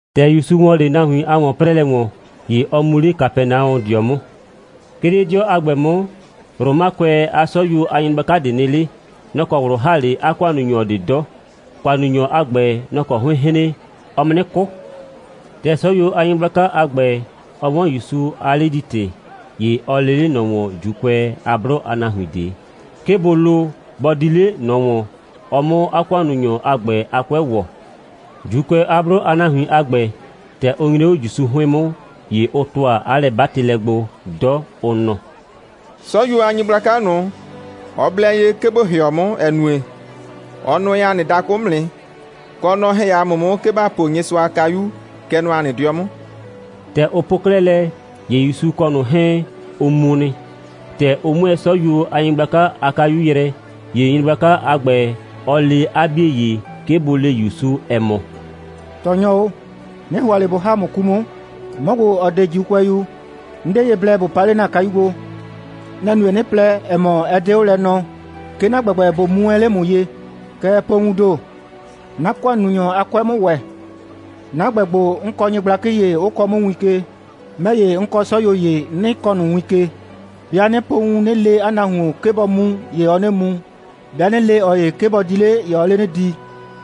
‑Tɛ ‑Yusu ‑wɔ 'le nahuin a ‑wɔn'prɛɛlɛ ‑wɔn, ‑ye ɔ mu 'le Kapɛnaɔdɩɔ 'mʋ. 'Ke 'le 'dɩɔ a ‑gbɛ 'mʋ, Romakʋɛ a 'sɔyuo a nyɩgblaka ꞊de nɩ 'le. Nɔ‑ kɔ ꞊wlʋ ‑ha 'le 'a ‑kʋannunyɔ ꞊de 'dɔ. ‑Kʋannunyɔ a ‑gbɛ, nɔ‑ kɔ 'hʋɩɩn‑ hren, ɔɔ mu 'nɩ 'kʋ. ‑Tɛ 'sɔyuo a nyɩgblaka a ‑gbɛ, ɔ 'wɔn ‑Yusu a 'ledi‑tɩ, ‑ye ɔ lee 'le ꞊nɔ ‑wɔn ‑Juukʋɛ a 'blʋ a nahuin ꞊de, 'ke bʋ lo, bɔ di 'le ꞊nɔ ‑wɔn, ɔ 'mʋ 'a ‑kʋannunyɔ a ‑gbɛ a 'kʋɛ ‑wɔ. ‑Juukʋɛ a 'blʋ a nahuin a ‑gbɛ, ‑tɛ ʋ nyre 'o ‑Yusu 'hʋɩn 'mʋ, ‑ye ʋ ‑tʋa 'a lɛ'batɩlɛ gbo 'dɔ, ʋ nɔ: «'Sɔyuo a nyɩgblaka ꞊nʋ, ɔ blɛ ye, 'ke ‑bo ‑hɩɔ 'mʋ, ‑ɛ nue, ɔ nʋɛ ‑a nɩ dakʋ 'mʋ nɩ, kɔ, nɔ‑ ‑hɛ ‑a mʋ 'mʋ, 'ke ‑ba po Nyɩsʋa a kayu, kɛ nɔ ‑a nɩ 'dɩɔ 'mʋ.» ‑Tɛ ʋ po 'klɛɛ lɛ, ‑ye ‑Yusu kɔ ꞊nʋ 'hɛɛn, ʋ mu nɩ. ‑Tɛ ʋ 'mʋɛɛ 'sɔyuo a nyɩgblaka a kayu yrɛ, ‑ye nyɩgblaka a ‑gbɛ, ɔ le 'a 'bie ‑ye, 'ke bʋ le ‑Yusu, ‑ɛ mɔ: «Tɔɔnyɔ o, 'nɩ ‑hʋa ꞊le ꞊bo ‑ha ‑mʋ 'ku 'mʋ. 'Mɔ ‑gbo, ‑ɔ 'de ‑Juukʋɛyu, 'n 'de ye blɛ ‑bo pa 'le 'na kayu gbo. Nɛ‑ nue, 'nɩ plɛ, ‑ɛ mɔ, ɛ 'de 'o lɛ nɔɔ, 'ke 'na ‑gbɛgbɛ ꞊bo mu wɛn 'le ‑mʋ ye. Kɛɛ, po wuun ‑do, 'na ‑kʋannunyɔ a 'kʋɛ 'mʋ ‑wɛ. 'Na ‑gbɛ ‑gbo, 'n kɔ nyɩgblakɩ ‑ye, 'ʋ kɔɔ 'mʋ win ke. 'Mɛ ‑ye, 'n kɔ 'sɔyuo ‑ye, 'nɩ kɔɔ ꞊nʋ win ke. 'Bɩa 'nɩ po wun, 'nɩ le 'a nahuon, 'ke bɔ mu, ‑ye ɔɔ 'nɩ mu. 'Bɩa 'nɩ le ꞊ɔ ‑ye, 'ke bɔ di 'le, ‑ye ɔɔ 'le 'nɩ di.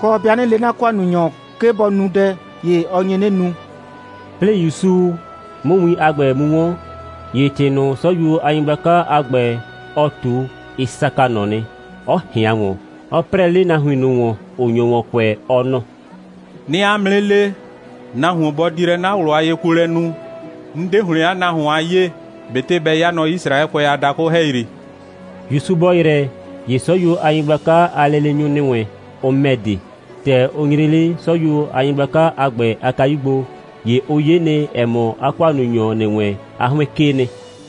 Kɔ, 'bɩa 'nɩ le 'na ‑kʋannunyɔ, 'ke bɔ nu dɛ, ‑ye ɔ nye 'nɩ nu.» 'Plɩɩ ‑Yusu 'mʋ win a ‑gbɛ mu 'wɔn, ‑ye ‑tɩ ꞊nʋ, 'sɔyuo a nyɩgblaka a ‑gbɛ, ɔ ꞊tu, ɩ saka ꞊nɔ nɩ, 'ɔ ꞊hɩan ‑wɔn, 'ɔ 'prɛɛ 'le nahuin ꞊nʋ ‑wɔn, ‑ʋ nyo ‑wɔn kʋɛ, ɔ nɔ: «'Nɩɩ 'a mʋ 'nɩ le: Nahuon, bɔ di lɛ 'na ꞊wlʋ a yekuolɛ nu, 'n 'de ‑hlɩn 'a nahuon a 'yee, ꞊betɩ bɛ 'ya nɔ Yisraɛkʋɛ a dakʋ ‑hɛyri.» ‑Yusu bɔ ‑yrɛ, ‑ye 'sɔyuo a nyɩgblaka a leenyʋ ‑nɩ wɛn, ʋ ‑mɛ de. ‑Tɛ ʋ nyre 'le 'sɔyuo a nyɩgblaka a ‑gbɛ a kayu gbo, ‑ye ʋ 'ye nɩ, ‑ɛ mɔ, 'a ‑kʋannunyɔ ‑nɩ wɛn, 'a 'hʋɩn 'kee nɩ.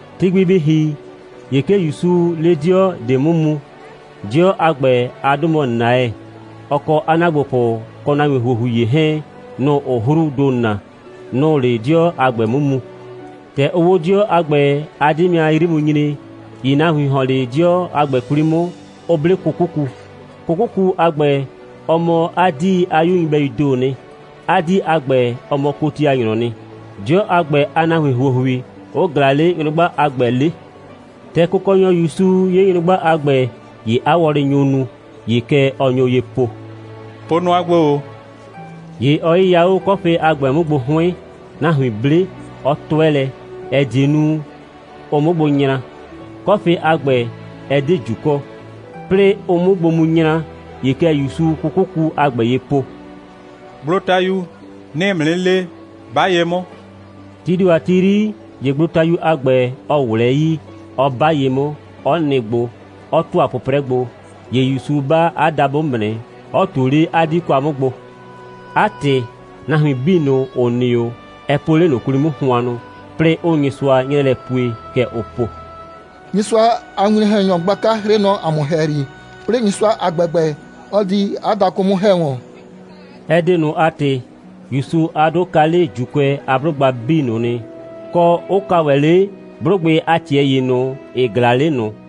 Ti gbi bɩ ‑hi, ‑ye 'ke ‑Yusuu 'le 'dɩɔ ꞊de 'mʋ mu. 'Dɩɔ a ‑gbɛ a 'dʋ mɔ Naɛ. Ɔ kɔ 'a ‑naagbopʋ kɔ nahuin ‑huohui ‑ye 'hɛɛn, nʋ‑ʋ 'hruu ‑do na, nʋ‑ʋ 'le 'dɩɔ a ‑gbɛ 'mʋ mu. ‑Tɛ ʋʋ 'o 'dɩɔ a ‑gbɛ a 'dɩmɩa 'yri mu nyre, ‑ye nahuin ‑hɔn 'le 'dɩɔ a ‑gbɛ 'kwli 'mʋ, 'ʋ 'ble 'kʋkʋku. 'Kʋkʋku a ‑gbɛ, ɔ mɔ 'a 'dii a 'yu nyɩbɛyuu ‑doo nɩ. 'A 'dii a ‑gbɛ, ɔ mɔ kotianyrɔɔ nɩ; 'dɩɔ a ‑gbɛ a nahuin ‑huohui 'ʋ ꞊glaa 'le nyrʋgba a ‑gbɛ 'le. ‑Tɛ Kʋkɔnyɔ ‑Yusu 'ye nyrʋgba a ‑gbɛ, ‑ye 'a wɔlɩ nyo nu. ‑Ye kɛ ɔ nyo ye po: «Po nʋa gbo ‑o!» ‑Ye ɔ 'yɩya 'o 'kɔfɩ a ‑gbɛ 'mʋ gbo 'hʋɩn, nahuin 'ble, 'ɔ 'tʋɛ lɛ, ‑ɛ die nu, ʋ 'mʋ gbo nyra. 'Kɔfɩ a ‑gbɛ, ɛ 'de ꞊ju kɔ. 'Plɩɩ ʋ 'mʋ gbo mu nyra, ‑ye kɛ ‑Yusuu 'kʋkʋku a ‑gbɛ ye po: «Gblotayu, 'nɩɩ ‑mʋ 'nɩ le, 'ba ye 'mʋ!» Tii ‑do a ti 'yri, ‑ye gblotayu a ‑gbɛ, ɔ ꞊wlɛɛ 'yii, 'ɔ 'ba ye 'mʋ, 'ɔ nɩ gbo, 'ɔ ‑tʋa 'pʋprɛ gbo. ‑Ye ‑Yusu 'ba 'a dabʋ 'mʋ nɩ, 'ɔ ꞊tuo 'le 'a 'dii kwa 'mʋ gbo. 'A ‑tɩ, nahuin 'bii ꞊nʋ, ‑ʋ nɩ 'o, ɛ po 'le ꞊nʋ 'kwli 'mʋ hʋannʋ, 'plɩɩ 'ʋʋ Nyɩsʋa 'nyrɛɛ lɛ pue, kɛ ʋʋ po: «Nyɩsʋa a winwlɔn‑hɛnyɔ gblaka 'hrɩɩ nɔ ‑a mʋ ‑hɛyri, 'plɩɩ Nyɩsʋa a ‑gbɛgbɛ 'ɔ di 'a dakʋ 'mʋ ‑hɛ wɔn.» Ɛ ‑do ꞊nʋ a ‑tɩ, ‑Yusu a 'dʋ ka 'le ‑Juukʋɛ a 'blʋgba 'bii ꞊nʋ nɩ, kɔ, 'ʋ ka ‑wɛ 'le 'blʋgbɩ a ꞊tɩɛ ‑ye ꞊nʋ, ‑ɩ ꞊glaa 'le ꞊nʋ.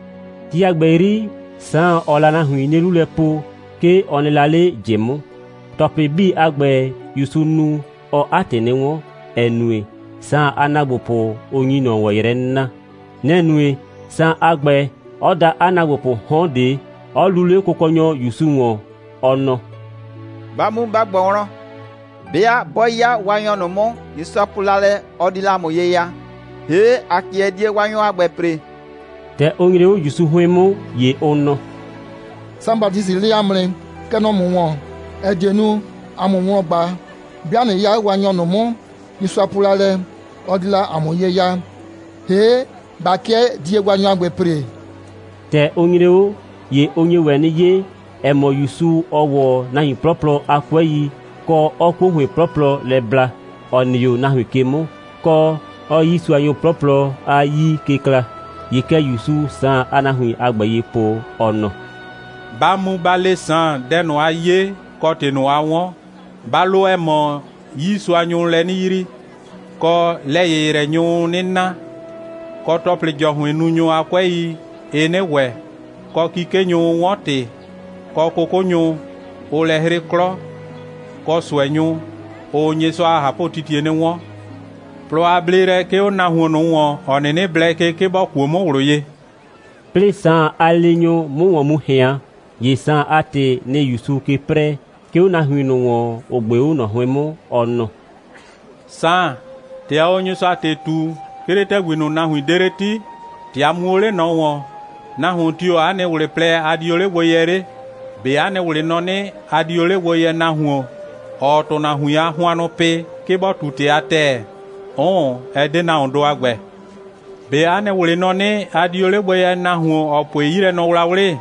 Ti a ‑gbɛ 'yri, Saan, ‑ɔɔ la nahuin 'nie 'lu lɛ po, ('ke ɔ nɩ la 'le ꞊jɩ 'mʋ.) ‑Tɔplɩ 'bii a ‑gbɛ, ‑Yusuu nu, ɔɔ 'a ‑tɩ 'nɩ 'wɔn, ‑ɛ nue, Saan a ‑naagbopʋ, ʋ nyi ꞊nɔ ‑wɔn yrɛ 'nɩ na. Nɛ‑ nue, Saan a ‑gbɛ, 'ɔ da 'a ‑naagbopʋʋ 'hɔn ꞊de, 'ɔ luu 'le Kʋkɔnyɔ ‑Yusu ‑wɔn, ɔ nɔ: «Ba mu, ba ꞊gbɔ wlɔn, 'bɩa 'bɔ 'ya Waanyɔ ꞊nʋ 'mʋ, Nyɩsʋa po la lɛ, ɔ di la ‑a mʋ ye ya, ‑hee', ‑a 'kɩɛ die Waanyɔ a ‑gbɛ ‑pre?» ‑Tɛ ʋ nyre 'o ‑Yusu 'hʋɩn 'mʋ, ‑ye ʋ nɔ: «Saan Batisɩ lee ‑a mʋ nɩ, kɛ nɔ ‑mʋ ‑wɔn, ‑ɛ die nu, ‑a 'mʋ ‑mʋ wlɔn ꞊gba, 'bɩa ꞊nɩ 'ya Waanyɔ ꞊nʋ 'mʋ, Nyɩsʋa po la lɛ, ɔ di la ‑a mʋ ye ya, ‑hee', ꞊ba 'kɩɛ die Waanyɔ a ‑gbɛ ‑pre?» ‑Tɛ ʋ nyre 'o, ‑ye ʋ nye ‑wɛ 'nɩ 'ye, ‑ɛ mɔ, ‑Yusu, ɔɔ ‑wɔ nahuin 'plɔplɔ a 'kʋɛi, kɔ, 'ɔɔ 'kuo ‑hʋɩn 'plɔplɔ lɛ bla, ‑ɔ nɩ 'o nahuin ke 'mʋ, kɔ, 'ɔɔ 'yiisuanyʋ 'plɔplɔ a 'yii ke kla. ‑Ye kɛ ‑Yusu Saan a nahuin a ‑gbɛ ye po, ɔ nɔ: «Ba mu, ba le Saan dɛ ꞊nʋ, a 'ye, kɔ ‑tɩ ꞊nʋ, a 'wɔn. Ba lo, ‑ɛ mɔ, 'yiisuanyʋʋ lɛ 'nɩ yrii, kɔ, lɛ‑yɩyrɛnyʋʋ 'nɩ na, kɔ, ‑tɔplɩ‑jɔhʋɩnnunyʋ a 'kʋɛi, ɩɩ 'nɩ ‑wɛ, kɔ, 'kikenyʋʋ 'wɔn ‑tɩ, kɔ, 'kʋkʋnyʋ, ʋʋ lɛ 'hrɩ 'klɔ, kɔ, ꞊sʋɛnyʋ, ʋʋ Nyɩsʋa a ꞊hapʋtitie 'nɩ 'wɔn. Plɔ a bleelɛ 'ke 'o nahuon ꞊nʋ ‑wɔn, ‑ɔ 'nɩnɩ blɛ ke, 'ke bɔ kuo 'mʋ ꞊wlʋ ye.» 'Plɩɩ Saan a leenyʋ 'mʋ ‑wɔn mu ꞊hɩan, ‑ye Saan a ‑tɩ, nɩ‑ ‑Yusuu ke 'prɛɛ, 'ke 'o nahuin ꞊nʋ ‑wɔn, ‑ʋ ꞊gbe 'o ꞊nɔ 'hʋɩn 'mʋ, ɔ nɔ: «Saan, ‑tɛ ɔɔ o Nyɩsʋa a ‑tɩ ꞊tu, 'ke 'le ‑tɛgbi ꞊nʋ, nahuin 'de 'le 'ti, ‑tɛ a mu o 'le ꞊nɔ ‑wɔn, nahuon tio‑ 'a nɩ ꞊wlɩ plɛ, a di o 'le gbo yɛ 'le? ꞊Be 'a nɩ ꞊wlɩ nɔ 'nɩ, a di o 'le gbo yɛ nahuon, ‑ɔɔ ‑tʋnahuin a hʋannʋ pɩ, 'ke bɔ ꞊tu ‑tɩ a ‑tɛɛ? 'Ʋʋn, ɛ 'de nahuondʋ a ‑gbɛ. ꞊Be 'a nɩ ꞊wlɩ nɔ 'nɩ, a di o 'le gbo yɛ nahuon, ‑ɔ pue 'yilɛnɔwlawlɩ?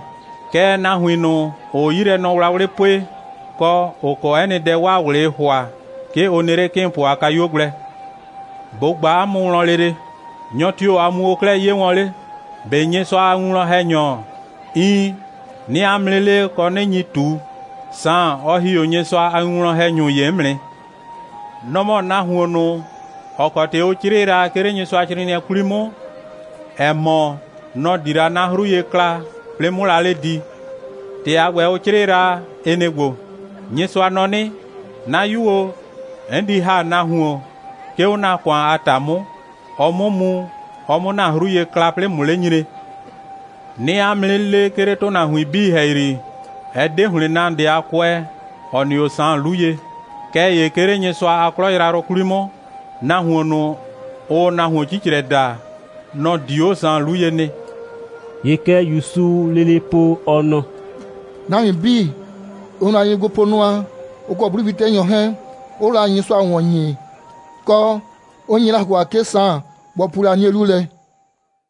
Kɛɛ, nahuin ꞊nʋ, ‑ʋʋ 'yilɛnɔwlawlɩ pue, kɔ, ‑ʋ kɔ 'ɛ nɩ dɛ, 'waa ꞊wlɩɩ ‑hʋa, 'ke ʋ nɩ 'le 'kɩɩnpʋ a kayuo gblɛ. ꞊Bo ꞊gba 'a mʋ wlɔn lele: Nyɔ tio‑ a mu o 'klɛɛ 'ye wɔn 'le? ꞊Be Nyɩsʋa a winwlɔn‑hɛnyɔ? Iin, 'nɩɩ 'a mʋ 'nɩ le, kɔ, 'nɩ nyi ꞊tu, Saan, ɔ ‑hi 'o Nyɩsʋa a winwlɔn‑hɛnyʋ ‑ye 'mʋ nɩ. Nɔ‑ mɔ nahuon ꞊nʋ, ‑ɔ kɔ ‑tɩ ʋ 'crɩɩ la, 'ke 'le Nyɩsʋacrɩɩnɩɛ 'kwli 'mʋ, ‑ɛ mɔ, nɔ‑ di la 'na 'hru ye kla, 'plɩɩ 'mʋ la 'le di. ‑Tɩ a ‑gbɛ, ʋ 'crɩɩ la, ɩ nɩ‑ ‑gbo: Nyɩsʋa nɔ 'nɩ: 'Na 'yu o, 'n di ‑ha nahuon, 'ke 'o 'na ‑kʋan a ‑ta 'mʋ, ɔ 'mʋ mu, ɔ 'mʋ ‑na 'hru ye kla, 'plɩɩ ꞊mʋ 'le nyre. 'Nɩɩ 'a mʋ 'nɩ le, 'ke 'le ‑tʋnahuin 'bii ‑hɛyri, ɛ 'de ‑hlɩn nahuon ꞊de a kʋɛ, ‑ɔ nɩ 'o Saan 'lu ye. Kɛɛ ‑ye 'ke 'le Nyɩsʋa a 'klɔ yrayrʋ 'kwli 'mʋ, nahuon ꞊nʋ, ʋʋ nahuon 'cicrɛ daa, nɔ‑ di 'o Saan 'lu ye nɩ.» ‑Ye kɛ ‑Yusuu lele po, ɔ nɔ: «Nahuin 'bii, ʋ nyo la ye gbo po nʋa, ʋ kɔ 'blʋwli'tɛnyʋ 'hɛɛn, 'ʋʋ la Nyɩsʋa ꞊wɔn ‑nyi, kɔ, 'ʋ nye la ‑hʋa, 'ke Saan bɔ pu 'nie 'lu lɛ.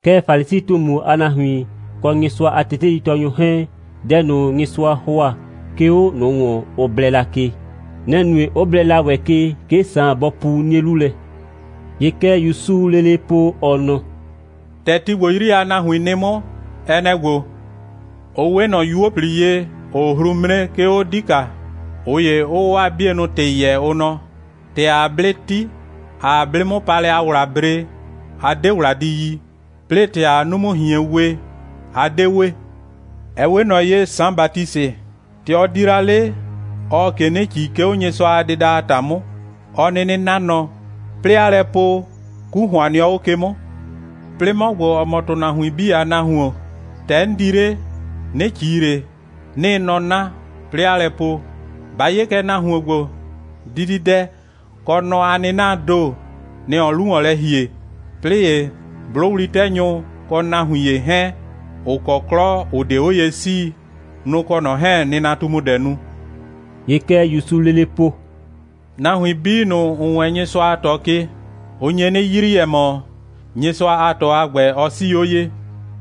Kɛɛ, Falisi꞊tumu a nahuin, kɔ Nyɩsʋa a teteitɔɔnyʋ 'hɛɛn, dɛ ꞊nʋ, Nyɩsʋa ‑hʋa, 'ke 'o ꞊nʋ ‑wɔn, ʋ blɛ la ke, nɛ‑ nue, 'ʋ blɛ la ‑wɛ ke, 'ke Saan bɔ pu 'nie 'lu lɛ.» ‑Ye kɛ ‑Yusuu lele po, ɔ nɔ: «‑Tɛ ti ‑gbo 'yri a nahuin nɩ 'mʋ, ɛ nɛ‑ ‑gbo: Ʋ 'we ꞊nɔ 'yuo꞊pli ye, ‑ʋʋ hru 'mre, 'ke 'o 'dika, ꞊ʋ ‑yee 'ʋʋ 'waa 'bienʋ ‑tɩ yɛɛ, ʋ nɔ: ‑Tɛ ‑aa 'blɩ 'ti, ‑aa 'blɩ'mʋpaalɛ a ‑wla bre, a 'de ‑wla di yi. 'Plɩɩ ‑tɛ ‑aa 'numu꞊hien we, a 'de we. Ɛ 'we ꞊nɔ ye, Saan Batisɩ, ‑tɛ ɔ di la 'le, ɔɔ ꞊ke 'nɩ ꞊ci, 'ke 'o Nyɩsʋa a dɩda a ‑ta 'mʋ, 'ɔ 'nɩnɩ 'na nɔ, 'plɩɩ 'aa lɛ po: 'Ku ‑hʋan nɩɔ 'o ke 'mʋ. 'Plɩɩ 'mɔ ‑gbo, ‑ɔ mɔ ‑tʋnahuin 'bii a Nahuon, ‑tɛ 'n di 'le, 'nɩ ꞊ci ꞊le, 'nɩɩ nɔ 'na, 'plɩɩ 'aa lɛ po: Ba 'ye kɛ, nahuon ‑gbo, dididɛ kɔ nɔ a 'nɩnaa ‑do, nɛ‑ ɔɔ 'lu ‑wɔn lɛ ‑hie, 'plɩɩ ‑ye 'blʋwli'tɛnyʋ kɔ nahuin ‑ye 'hɛɛn, ‑ʋ kɔ 'klɔ, ‑ʋ 'de 'o ye 'sii, nʋ‑ kɔ ꞊nɔ 'hɛɛn‑ nɩnatumudɛ nu.» ‑Ye kɛ ‑Yusuu lele po: «Nahuin 'bii ꞊nʋ, ‑ʋ wɛɛn Nyɩsʋa a ꞊tɔ ke, ʋ nye 'nɩ yrii, ‑ɛ mɔ, Nyɩsʋa a ꞊tɔ a ‑gbɛ, ɔ 'sii 'o ye.»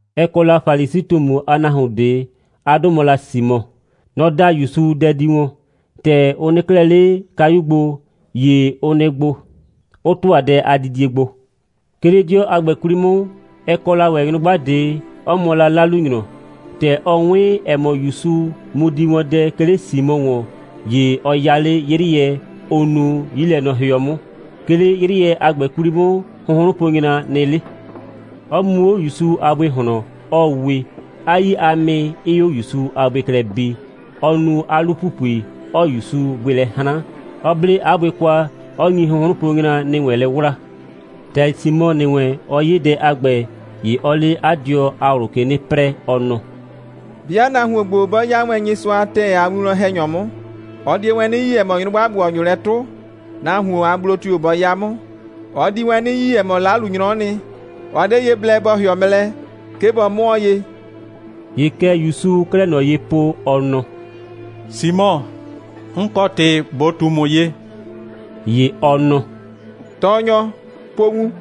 Ɛ kɔ la Falisi꞊tumu a nahuon ꞊de. 'A 'dʋ mɔ la Simɔ. Nɔ‑ da ‑Yusu dɛ di wɔn. ‑Tɛ ʋ nɩ 'klɛɛ 'le kayu gbo, ‑ye ʋ nɩ gbo, 'ʋ ‑tʋa dɛ a didie gbo. 'Ke 'le 'dɩɔ a ‑gbɛ 'kwli 'mʋ, ɛ kɔ ‑wɛ nyrʋgba ꞊de, 'ɔ mɔ 'lalunyrɔ. ‑Tɛ ɔ 'wɩn, ‑ɛ mɔ, ‑Yusu mu di wɔn dɛ, 'ke 'le Simɔ ‑wɔn, ‑ye ɔ ya 'le 'yrɩɛ, ʋ nuu 'yilɛnɔhɩɔ 'mʋ. 'Ke 'le 'yrɩɛ a ‑gbɛ 'kwli 'mʋ, hʋnhrʋnponyra nɩ 'le; 'ɔ mu 'o ‑Yusu a bʋɩ ꞊hlɔn, 'ɔɔ we, 'a 'yii a mɩ 'ɩɩ 'o ‑Yusu a bʋɩ klɛ bi, 'ɔ nu 'a 'lu‑pupui, 'ɔɔ ‑Yusu bʋɩ lɛ 'hran, 'ɔ 'ble 'a bʋɩ kwa, 'ɔ nyi hʋnhrʋnponyra ‑nɩ wɛn lɛ 'wlaa. ‑Tɛ Simɔ ‑nɩ wɛn, ɔ 'ye dɛ a ‑gbɛ, ‑ye ɔɔ 'le 'a dɩɔnʋ a ꞊wlʋ ke 'nɩ 'prɛɛ, ɔ nɔ: «'Bɩa nahuon ‑gbo 'bɔ 'ya wɛn Nyɩsʋa a ‑tɛɛ a winwlɔn‑hɛnyɔ 'mʋ, ɔ di wɛn 'nɩ yi, ‑ɛ mɔ, nyrʋgba ‑gbo, ‑ɔ nyo lɛ 'tʋ, nahuon a gblo tio‑ bɔ 'ya 'mʋ. Ɔ di wɛn 'nɩ yi, ‑ɛ mɔ, 'lalunyrɔ'ɔ nɩ, ɔ 'de ye blɛ bɔ ‑hɩɔ mɛ lɛ, 'ke bɔ 'mʋɔɔ ye.» ‑Ye kɛ ‑Yusuu 'klɛɛ ꞊nɔ ye po, ɔ nɔ: «Simɔ, 'n kɔ ‑tɩ ꞊bo ꞊tu ‑mʋ ye.» ‑Ye ɔ nɔ: «Tɔɔnyɔ, po wun.»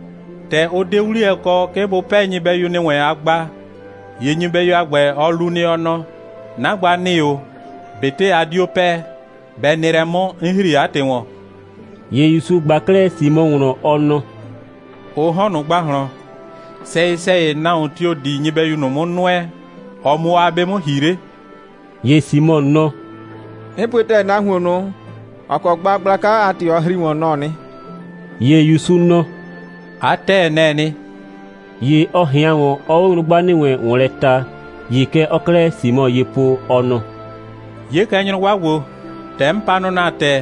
‑Tɛ ʋ 'de 'wliyɛ kɔ, 'ke bʋ 'pɛɛ nyɩbɛyu ‑nɩ wɛn a gba, ‑ye nyɩbɛyu a ‑gbɛ, ɔ lu nɩ, ɔ nɔ: 'Na gba ‑nɩ o, ꞊betɩ ba 'dio 'pɛɛ, bɛ nɩ lɛ 'mʋ, 'n ‑hri 'a ‑tɩ ‑wɔn.» ‑Ye ‑Yusu ꞊gba 'klɛɛ Simɔ wlɔn, ɔ nɔ: «Ʋ 'hɔn ꞊nʋ ‑gbahlɔn, sɛyɩ‑sɛyɩ, nahuon tio‑ di nyɩbɛyu ꞊nʋ 'mʋ nʋɛ, ɔ 'mʋ 'o 'a 'be 'mʋ ‑hi 'le?» ‑Ye Simɔ nɔ: «'N pue ‑tɛɛ, nahuon ꞊nʋ, ‑ɔ kɔ gba gblaka a ‑tɩ ɔ ‑hri ‑wɔn, nɔ‑ɔ nɩ.» ‑Ye ‑Yusu nɔ: «'A ‑tɛɛ, nɛ‑ɛ nɩ.» ‑Ye ɔ ꞊hɩan ‑wɔn, 'ɔɔ 'o nyrʋgba ‑nɩ wɛn ‑wɔn lɛ ta, ‑ye kɛ ɔɔ 'klɛɛ Simɔ ye po, ɔ nɔ: «'Ye kɛ nyrʋgba ‑gbo. ‑Tɛ 'n pa nɔ ‑na ‑tɛ,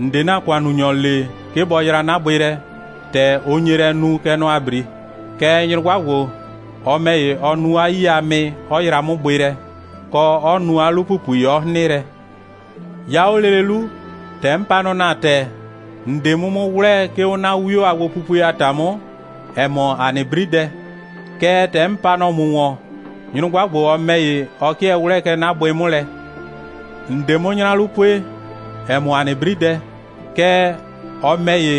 ‑n 'de ‑na ‑kʋannunyɔ le, 'ke bɔ yra 'na bʋɩ lɛ, ‑tɛ ʋ nye lɛ nu, kɛ nɔ ‑a 'bri. Kɛɛ, nyrʋgba ‑gbo, ɔ ‑mɛ ‑ye, ɔ nu 'a 'yii a mɩ, 'ɔ yra 'mʋ bʋɩ lɛ, kɔ 'ɔ nu 'a 'lu‑pupui, 'ɔ 'hrɩn lɛ. 'Ya 'o lele 'lu, ‑tɛ 'n pa nɔ ‑na ‑tɛ, ‑n 'de 'mʋ 'mʋ 'wlɛɛ, 'ke 'o 'na 'wio a gbopupue a ‑ta 'mʋ, ‑ɛ mɔ ‑a nɩ 'bridɛ. Kɛɛ, ‑tɛ 'n pa nɔ ‑mʋ ‑wɔn, nyrʋgba ‑gbo, ɔ ‑mɛ ‑ye, ɔ 'kɩɛ 'wlɛɛ kɛ 'na bʋɩ 'mʋ lɛ. ‑N 'de 'mʋ 'nyra 'lu pue, ‑ɛ mɔ ‑a nɩ 'bridɛ, kɛɛ, ɔ ‑mɛ ‑ye,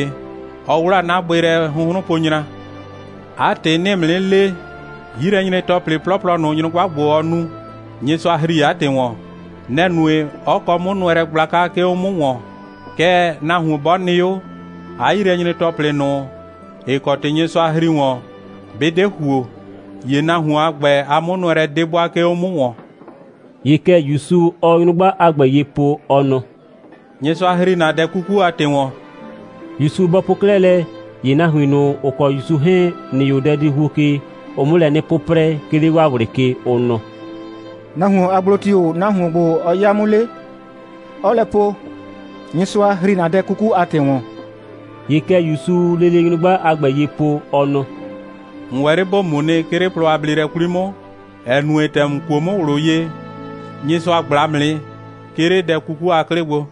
ɔ 'wlaa 'na bʋɩ lɛ hʋnhrʋnponyra. 'A ‑tɩ, 'nɩɩ ‑mʋ 'nɩ le, 'yilɛnyre‑tɔplɩ 'plɔplɔ ꞊nʋ, nyrʋgba ‑gbo, ɔ nu, Nyɩsʋa ‑hri 'a ‑tɩ ‑wɔn. Nɛ‑ nue, 'ɔ kɔ 'mʋnʋɛlɛ gblaka, 'ke 'o 'mʋ ‑wɔn. Kɛɛ, nahuon 'bɔ nɩ 'o, 'a 'yilɛnyre‑tɔplɩ ꞊nʋ, ‑ɩ kɔ ‑tɩ Nyɩsʋa ‑hri ‑wɔn, 'bɩ 'de ‑huo, ‑ye nahuon a ‑gbɛ a 'mʋnʋɛlɛ 'de ‑wɛ 'bʋa, 'ke 'o 'mʋ ‑wɔn.» ‑Ye kɛ ‑Yusu, ɔɔ nyrʋgba a ‑gbɛ ye po, ɔ nɔ: «Nyɩsʋa ‑hri ‑na dɛ 'kuku a ‑tɩ ‑wɔn.» ‑Yusu bɔ po 'klɛɛ lɛ, ‑ye nahuin ꞊nʋ, ‑ʋ kɔ ‑Yusu 'hɛɛn ‑nɩ 'o dɛdihuo ke, ʋʋ 'mʋ lɛ 'nɩ 'pʋprɛ, 'ke 'le 'waa ꞊wlɩ ke, ʋ nɔ: «Nahuon a gblo tio‑ nahuon ‑gbo, ɔ 'ya 'mʋ 'le, 'ɔɔ lɛ po: Nyɩsʋa ‑hri ‑na dɛ 'kuku a ‑tɩ ‑wɔn?» ‑Ye kɛ ‑Yusuu lele nyrʋgba a ‑gbɛ ye po, ɔ nɔ: «‑N ‑wɛ 'le ‑bo mu nɩ, 'ke 'le plɔ a bleelɛ 'kwli 'mʋ, ‑ɛ nue, ‑tɛ ‑n kuo 'mʋ ꞊wlʋ ye, Nyɩsʋa ꞊gbla ‑mʋ nɩ, 'ke 'le dɛ 'kuku a 'klɩ gbo.»